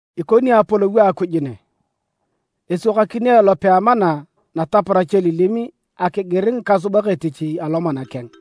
“Ikoni Apolou a Akuj ne. Eswakakini elope a amana nataparach elilim akigir ngikasubak etich alomana keng.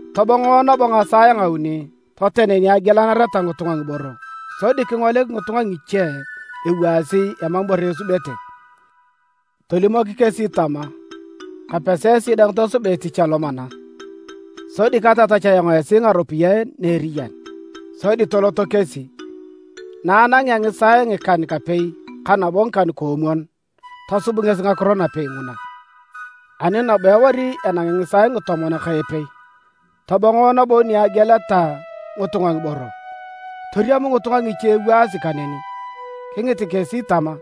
Tobong nabo ngisaae nguuni toten ni agielanareta ngitunga ngiboro sodi kingolik ngitunga ngiche ewaasi emam ibore esubete. Tolimok kesi tama: ‘Kapesi esi dang tosuba etich alomana, sodi katatach ayong esi ngaropiyae na eriyan’. Sodi toloto kesi. Na anangea ngisaae ngikan-kapei ka nabo ngikan-koomwon, tosub ngesi ngakiro napei nguna. Ani nabo ewari enangi ngisaae ngitomon ka epei, tobongo nabo ni egieleta ngitunga ngiboro, toriam ngitunga ngiche ewaasi kaneni. Kingit kesi tama,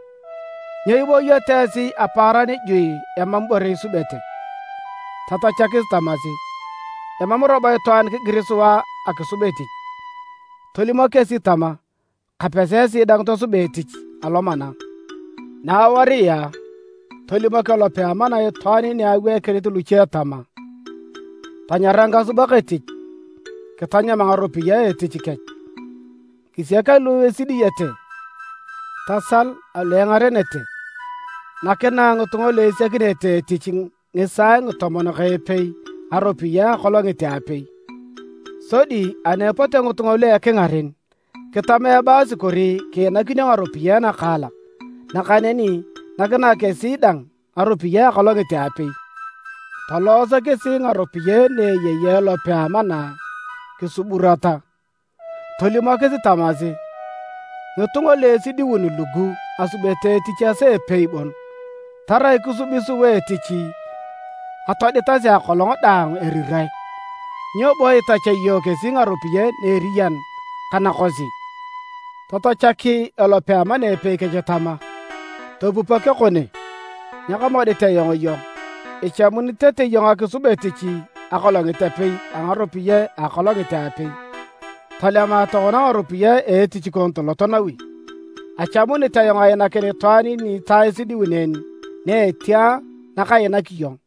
‘Nyo ibooyoto esi apaaran juui emam ibore isubete?’ Tatachakis tamasi, ‘Emam robo itwaan kigir sua akisub etich’. Tolimok kesi tama: ‘Kapesi esi dang tosuba etich alomana’. “Naawaria, tolimok elope a amana itwaan ni aweikinit luche tama: ‘Tanyara ngikasubak etich kitanyam ngaropiyae a etich kech, kisiak alu esidiyete, tasal alu engarenete’. Nakinae ngitunga lu esiakinete etich ngisaae ngitomon ka epei ngaropiyae a akolongit a apei. Sodi ani epote ngitunga lu ekingaren, kitama ebaasi kori kiinakinio ngaropiyae nakaalak, nakaneni nakinae kesi dang ngaropiyae a akolongit a apei. Tolooso kesi ngaropiyae ni eyei elope a amana kisuburata. Tolimokis tamasi: ‘Ngitunga lu esidiun lugu asubete etich esaa epei bon, tarai kisubi sua etich atoditasi akolong daang erirae, nyo bo itachea iyong kesi ngaropiyae na eriyan ka nakosi?’ Tatachak elope a amana epei kech tama: ‘Topupok ekone. Nyekamodit ayong iyong. Ichamuni tete iyong akisub etich akolongit apei a ngaropiyae a akolongit a apei. Tolema tokona ngaropiyae a etich kon tolot nawi. Achamunit ayong ainakin itwaan ni ta esidiun en na etia nakainak iyong.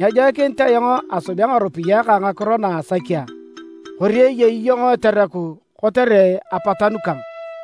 Nyejoikinit ayong asubea ngaropiyae kang ngakiro na asaki a? Kori eyei iyong etereku kotere apatanu kang?’”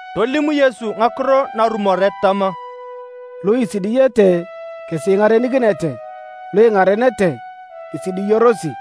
Tolim Yesu ngakiro narumoret tama, “Lu esidiyete kesi ingarenikinete, lu ingarenete, isidiyorosi.”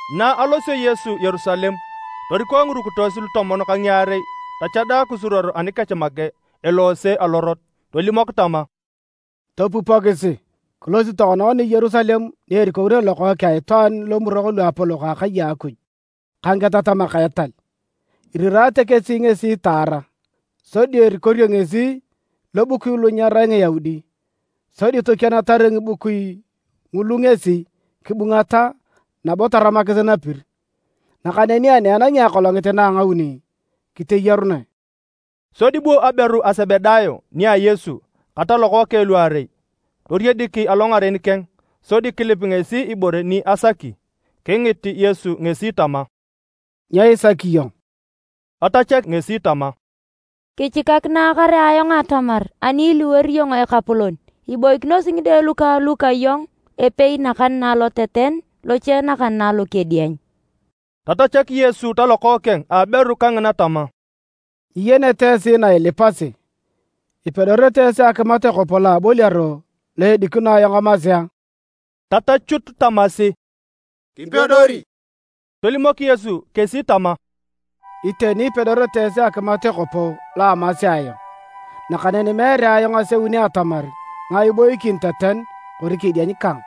Na alosio Yesu Yerusalem, toriko ngirukitos lutomon ka ngiarei tochada kisuruor anikech make eloose alorot tolimok tama, “Topupokisi! Kilosi tokona ngoni Yerusalem ni erikorere Lokookeng a Itwaan lomurok luapolok a akai a Akuj ka ngiketatamak a etal. Irirate kesi ngesi taara. Sodi erikorio ngesi lobukui lu nyerai Ngiyaudi, sodi tokienatar ngibukui ngulu ngesi kibungata nabo taramakis napir. Nakaneni ani enangi akolongit na a ngauni, kiteyarunae.” Sodi bu aberu a Sebedayo nia Yesu ka talokookeng luarei, toriedik alongaren keng, sodi kilip ngesi ibore ni asaki. Kingit Yesu ngesi tama, “Nyo isaki iyong?” Tatachak ngesi tama, “Kichikakinae kare ayong atamar ani iliwor iyong Ekapolon, iboikinosi ngide lukang lu ka iyong, epei nakan na aloteten, loche nakan na alokedieny.” Tatachak Yesu talokookeng a aberu kangina tama, “Nyiyenete esi na ilipasi. Ipedorete esi akimat ekopo lo aboliaro lo edikino ayong amasi a?” Tatachut tamasi, “Kipedori.” Tolimok Yesu kesi tama, “Iteni ipedorete esi akimat ekopo lo amasi ayong. Nakaneni meere ayong aseuni atamar ngae iboikin teten kori kedieny kang.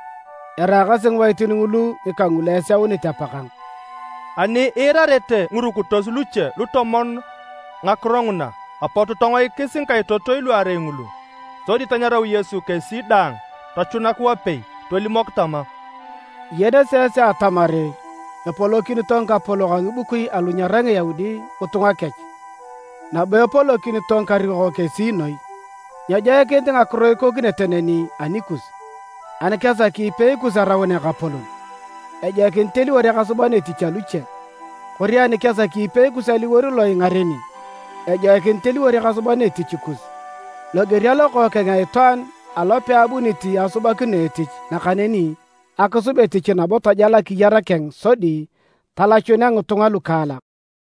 Eraakasi ngiwaitin ngulu ngika ngulu eseunit Apakang.” Ani iirarete ngirukitos luche lutomon ngakiro nguna, apot tongoikis ngikaitotoi luarei ngulu. Sodi tanyarau Yesu kesi daang tochunak wapei tolimok tama, “Iyenete esi atamar epolokinito ngikapolok a ngibukui alu nyerai Ngiyaudi ngitunga kech. Nabo epolokinito ngikarikok kesi noi. Nyejoikinit ngakiro ikokinete neni anikus. Ani kesaki ipei kus araun ekapolon, ejoikinit eliwor ekasuban etich aluche. Kori ani kesaki ipei kus aliwor lo ingareni, ejoikinit eliwor ekasuban etich kus. Loger a Lokookeng a Itwaan alo peabunit asubakino etich nakaneni akisub etich nabo tajal akiyar keng sodi talachunea ngitunga lukaalak.”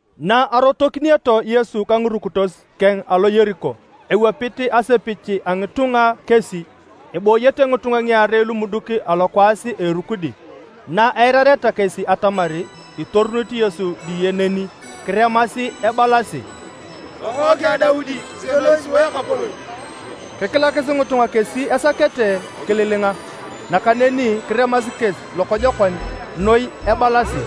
Na arotokineto Yesu ka ngirukitos keng alo Yeriko, ewapit asepich a ngitunga kesi. Ebooyete ngitunga ngiarei lumuduk alokwaas a erukudi. Naeirareta kesi atamar itorunit Yesu diye neni, kiremasi ebalasi, “Lokookeng a Daudi! Kisienoi sua Ekapolon!” Kikilakis ngitunga kesi esakete kililinga. Nakaneni kiremasi kesi lokojokon noi ebalasi,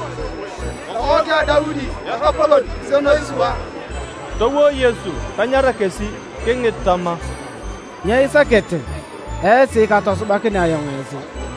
“Lokookeng a Daudi! Ekapolon! Kisienoi sua!” Towo Yesu tanyara kesi. Kingit tama, “Nyo isakete esi katosubakinea ayong esi?”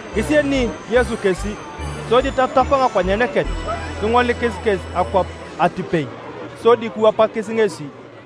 Kisieni Yesu kesi, sodi tatap ngakonyen kech, kingolikis kesi akwap atipei, sodi kiwapakis ngesi.